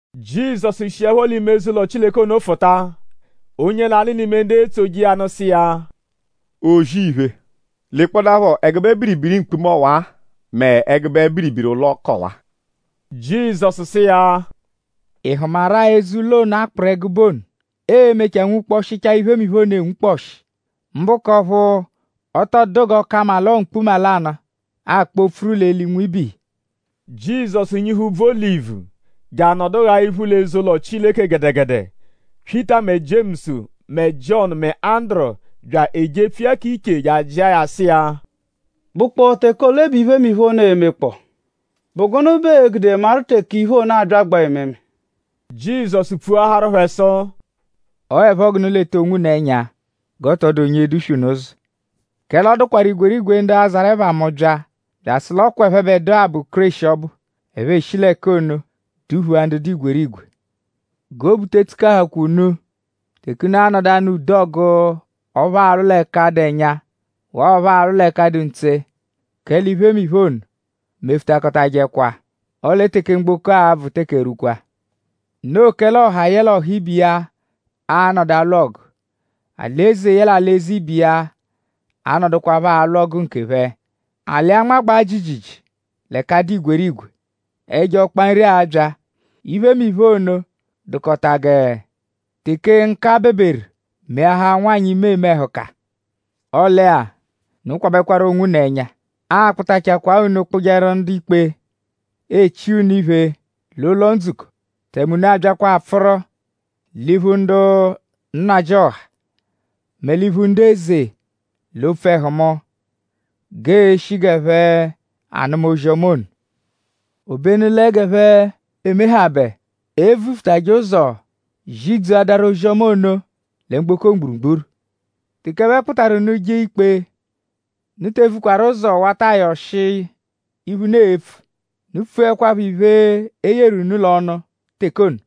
Jizọsu shiẹpho l'ime eze-ụlo Chileke ono fụta; onye lanụ l'ime ndu etsoje iya nụ sụ iya: “O-zì-iphe; lekpọdapho ẹgube biribiri mkpuma ọwa mẹ ẹgube biribiri ụlo k'ọwa!” Jizọsu sụ iya: “?Ị hụmaru-a eze-ụlo ono, a kpụru ẹgube ono; ee-mechaa nwukpọshichaa iphemiphe ono enwukpọshi; mbụ k'ọphu ọ tọ dụdu g'ọ ka mma l'ọo mkpuma lanụ, a-kpọ-pfuru l'eli nwibe iya.” Jizọsu nyihu úbvú Olivu; je anọdu gha iphu l'eze-ụlo Chileke gẹdegede. Pyịta mẹ Jiemusu mẹ Jiọnu mẹ Anduru bya ejepfu iya k'iche je ajịa ya sụ iya: “?Bụkpoo teke ole bẹ iphemiphe ono e-mekpọo?” “?Bụ gụnu bẹ ee-gude maru teke iphe ono abyagbaa ememe?” Jizọsu pfuaharu phẹ sụ: “Ọo 'ẹpho g'unu leta onwunu ẹnya g'ọ tọ dụ onye e-duswe unu ụzo. Kẹle ọ dụkwaru igwerigwe ndu a-zarụ ẹpha mu bya; bya asụ l'ọ kwa ẹphebedua bụ Kéreshi ọbu. Ẹphe eshi l'ẹka ono duphua ndu dụ igwerigwe. G'obu te tsukahukwa unu teke unu a-nọdu anụ ude ọgu ọphu aalwụ l'ẹka dụ ẹnya; waa ọphu aalwụ l'ẹka dụ ntse; kẹle iphemiphe ono mefutakọtajekwa; ọle teke mgboko a-bvụ teke erwukwa. Noo kẹle ọha yẹle ọha ibe iya a-nọdu alwụ ọgu; alị-eze yẹle alị-eze ibe iya a-nọdukwapho alwụ ọgu nkephẹ. Alị a-nmagbaa jiijiijii l'ẹka dụ igwerigwe. Ẹjo ọkpa nri a-bya. Iphemiphe ono dụkota gẹ teke nka beberu meahaa nwanyị, ime eme ẹhuka.” Ọle-a; unu kwabẹkwaru onwunu ẹnya. Aa-kpụtachakwaa unu kpụjeru ndu-ikpe; e chia unu iphe l'ụlo-ndzukọ; tẹme unu a-byakwa apfụru l'iphu ndu nnajịoha; mẹ l'iphu ndu eze l'opfu ẹhu mu; g'ee-shi g'ẹphe anụma ozi-ọma ono. Obenu lẹ g'e mehabẹ; e vufutajẹ ụzo zidzuadaru ozi-ọma ono lẹ mgboko mgburugburu. Teke ẹphe kpụtaru unu jee ikpe; unu te vukwaru ụzo wata ayọ ọshi iphe, unu e-pfu. Unu pfuẹkwapho iphe, e yeru unu l'ọnu teke ono;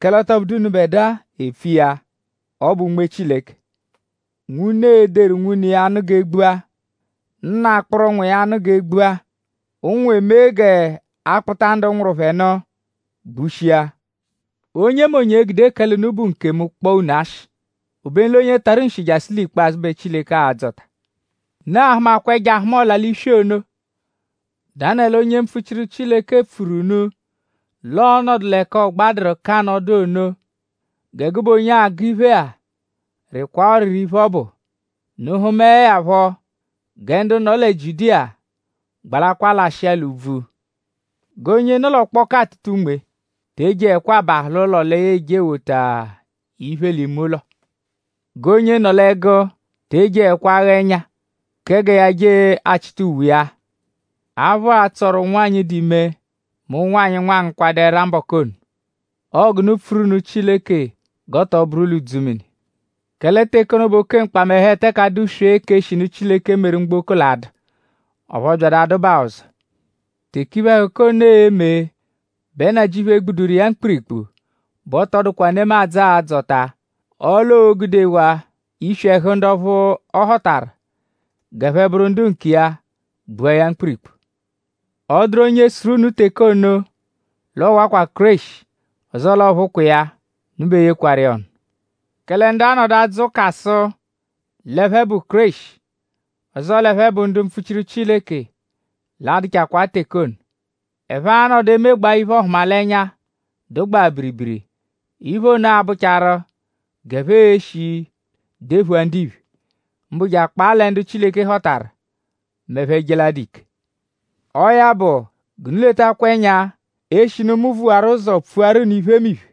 kẹle ọ tọ bụdu unubẹdua e-pfu iya; ọ bụ Unme Chileke. Nwune e-deru nwune iya nụ g'e gbua; nna akpụru nwa iya nụ g'e gbua. Ụnwu e-me g'a kpụta ndu nwụru phẹ nụ gbushia. Onyemonye e-gude kẹle unu bụ nkemu kpọo unu ashị; obenu l'onye tarụ nshi jasụ l'ikpazụ bẹ Chileke a-dzọta. “Unu a-hụmakwa ẹjo-ahụma-ọla-l'iswi ono, Danẹlu onye mpfuchiru pfuru unu l'ọonodu l'ẹka ọ gbadụru k'anọdu ono. (Gẹ gụbe onye agụ iphe-a rịkwaa ọriri iphe, ọ bụ.) Unu -hụmae ya phọ; gẹ ndu nọ lẹ Jiudiya gbalakwaa lashịa l'úbvú. G'onye nọ l'ọkpoku atụta unme te ejeẹkwa abahụ l'ụlo lẹ ya eje ewota iphe l'ime ụlo. G'onye nọ l'ẹgu te ejeẹkwa agha ẹnya kẹ gẹ ya je achịta uwe iya. Aphụ a-tsọru ụnwanyi, dụ ime mẹ ụnwanyi, nwa angụkwadu ẹra mbọku ono. Ọo g'unu pfuru nụ Chileke g'ọ tọ bụru l'udzumini. Kẹle teke ono bẹ oke mkpamẹhu, eteke adụswee k'eshinu Chileke meru mgboko l'a-dụ; ọphu ọ byadu adụbaa ọzo. Teke iphe-ẹhuka ono e-me bẹ Nnajịuphu egbuduru iya mkpirikpu bẹ ọ tọ dụkwa nemadzụ, aa-dzọta. Ọle o gudewaa iswi ẹhu ndu ọphu ọ họtaru g'ẹphe bụru ndu nkiya gbua ya mkpirikpu. “Ọ -dụru onye sụru unu teke ono l'ọ wakwa Kéreshi; ọzoo l'ọ phụkwa iya; unu be yekwarụ iya ọnu. Kẹle ndu a-nọdu adzụ ụka sụ l'ẹphe bụ Kéreshi; ọzoo l'ẹphe bụ ndu mpfuchiru Chileke; a-dụchakwaa teke ono. Ẹphe a-nọdu emegbaa iphe-ọhumalenya, dụgbaa biribiri. Iphe ono a-bụcharu g'ẹphe e-shi dephua ndiphe; mbụ je akpaa lẹ ndu Chileke họtaru; m'ẹphe -je l'adụ ike. Ọo ya bụ; g'unu letakwaphọ ẹnya; eshinu mu vuwaru ụzo pfuaru unu iphemiphe.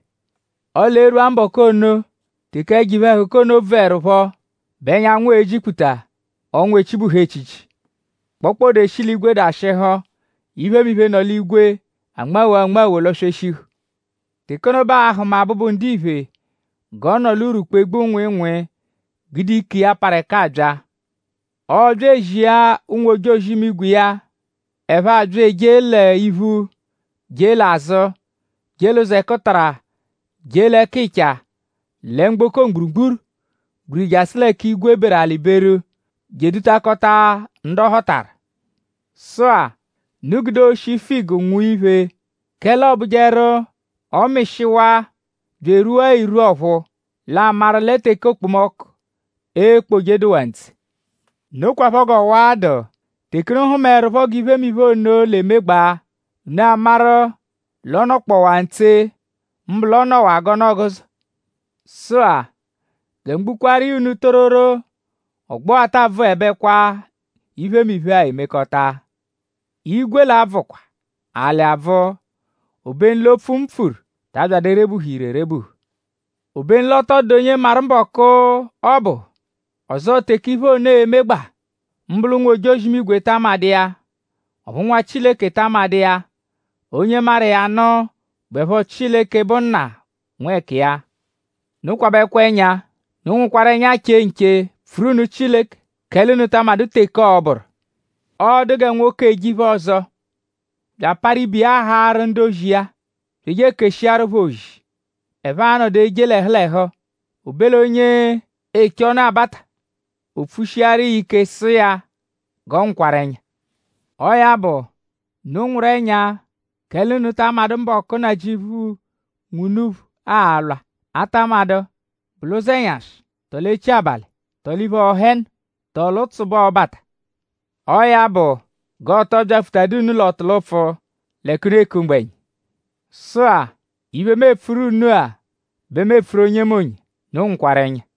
“Ọle e -rwua mbọku ono; teke ẹjo iphe-ẹhuka ono bvụerupho bẹ ẹnyanwu e-jikputa; ọnwa echibuhu echichi. Kpokpode eshi l'igwe dashịhu; iphemiphe, nọ l'igwe anmawoo anmawo lọ-sweshihu. Teke ono bẹ aa-hụma Abụbu-Ndiphe g'ọ nọ l'urwukpu egbu nwịinwii gude ike iya, parụ ẹka abya. Ọobya ezia ụnwu-ojozi-imigwe iya; ẹphe abya ejee l'iphu; jee l'azụ; jee l'ụzo ẹkutara; jee l'ẹkicha lẹ mgboko mgburugburu gbiriri jasụ l'ẹka igwe beru alị beru; je edutakọta ndu ọ họtaru.” “Sụ-a; unu gude oshi figu nwụa iphe; kẹle ọobujeru; ọ -mịshiwaa bya erwua irwu ọ̀phúú; l'a maru lẹ teke okpomọku ekpoje dụwaa ntse. Nokwaphọ g'ọwa-a dụ; teke unu hụmaerupho g'iphemiphe ono l'emegbaa; unu amaru l'ọ nọkpowaa ntse; mbụ l'ọ nọwaa g'ọnu-ọguzo. Sụ-a; gẹ mu gbukwaaru iya unu tororo; ọgbo-a taa bvụebekwa; iphemiphe-a emekọta. Igwe l'a-bvụkwa; alị abvụ; obenu l'opfu, mu pfuru ta abyadụ erebuhu ire erebuhu.” “Obenu l'ọ tọ dụdu onye maru mbọku, ọ bụ; ọzoo teke iphe ono e-megbaa. Mbụ l'ụnwu-ojozi-imigwe ta amadụ iya; ọphu Nwa Chileke ta amadụ iya. Onye maru iya nụ bụepho Chileke, bụ Nna nwẹkiya. Unu kwabẹkwa ẹnya. Unu nwụkwaru ẹnya che nche; pfuru nụ Chileke; kẹle unu ta amadụ teke ọo-bụru. Ọ dụ gẹ nwoke, eje iphe-ọzo; bya aparụ ibe iya haarụ ndu-ozi iya; bya eje keshiaru phẹ ozi, ẹphe a-nọdu eje l'ẹhu l'ẹhu. O be l'onye eche ọnu-abata; o pfushiaru iya ike sụ iya g'ọ nwụkwaru ẹnya. Ọo ya bụ; unu nwụru ẹnya; kẹle unu ta amadụ mbọku, Nnajịuphu, nwe unuphu a-lwa. A ta amadụ;?bụ l'ụzenyashi; tọo l'echi abalị; tọo l'iphe-ọhenu; tọo l'ụtsu bẹ ọo-bata. Ọo ya bụ; g'ọ tọo byapfutadu unu l'ọtulupfu l'ẹka unu eku mgbẹnya.” “Sụ-a; iphe, mu epfuru unu-a bẹ mu epfuru onyemonye. Unu nwụkwaru ẹnya!”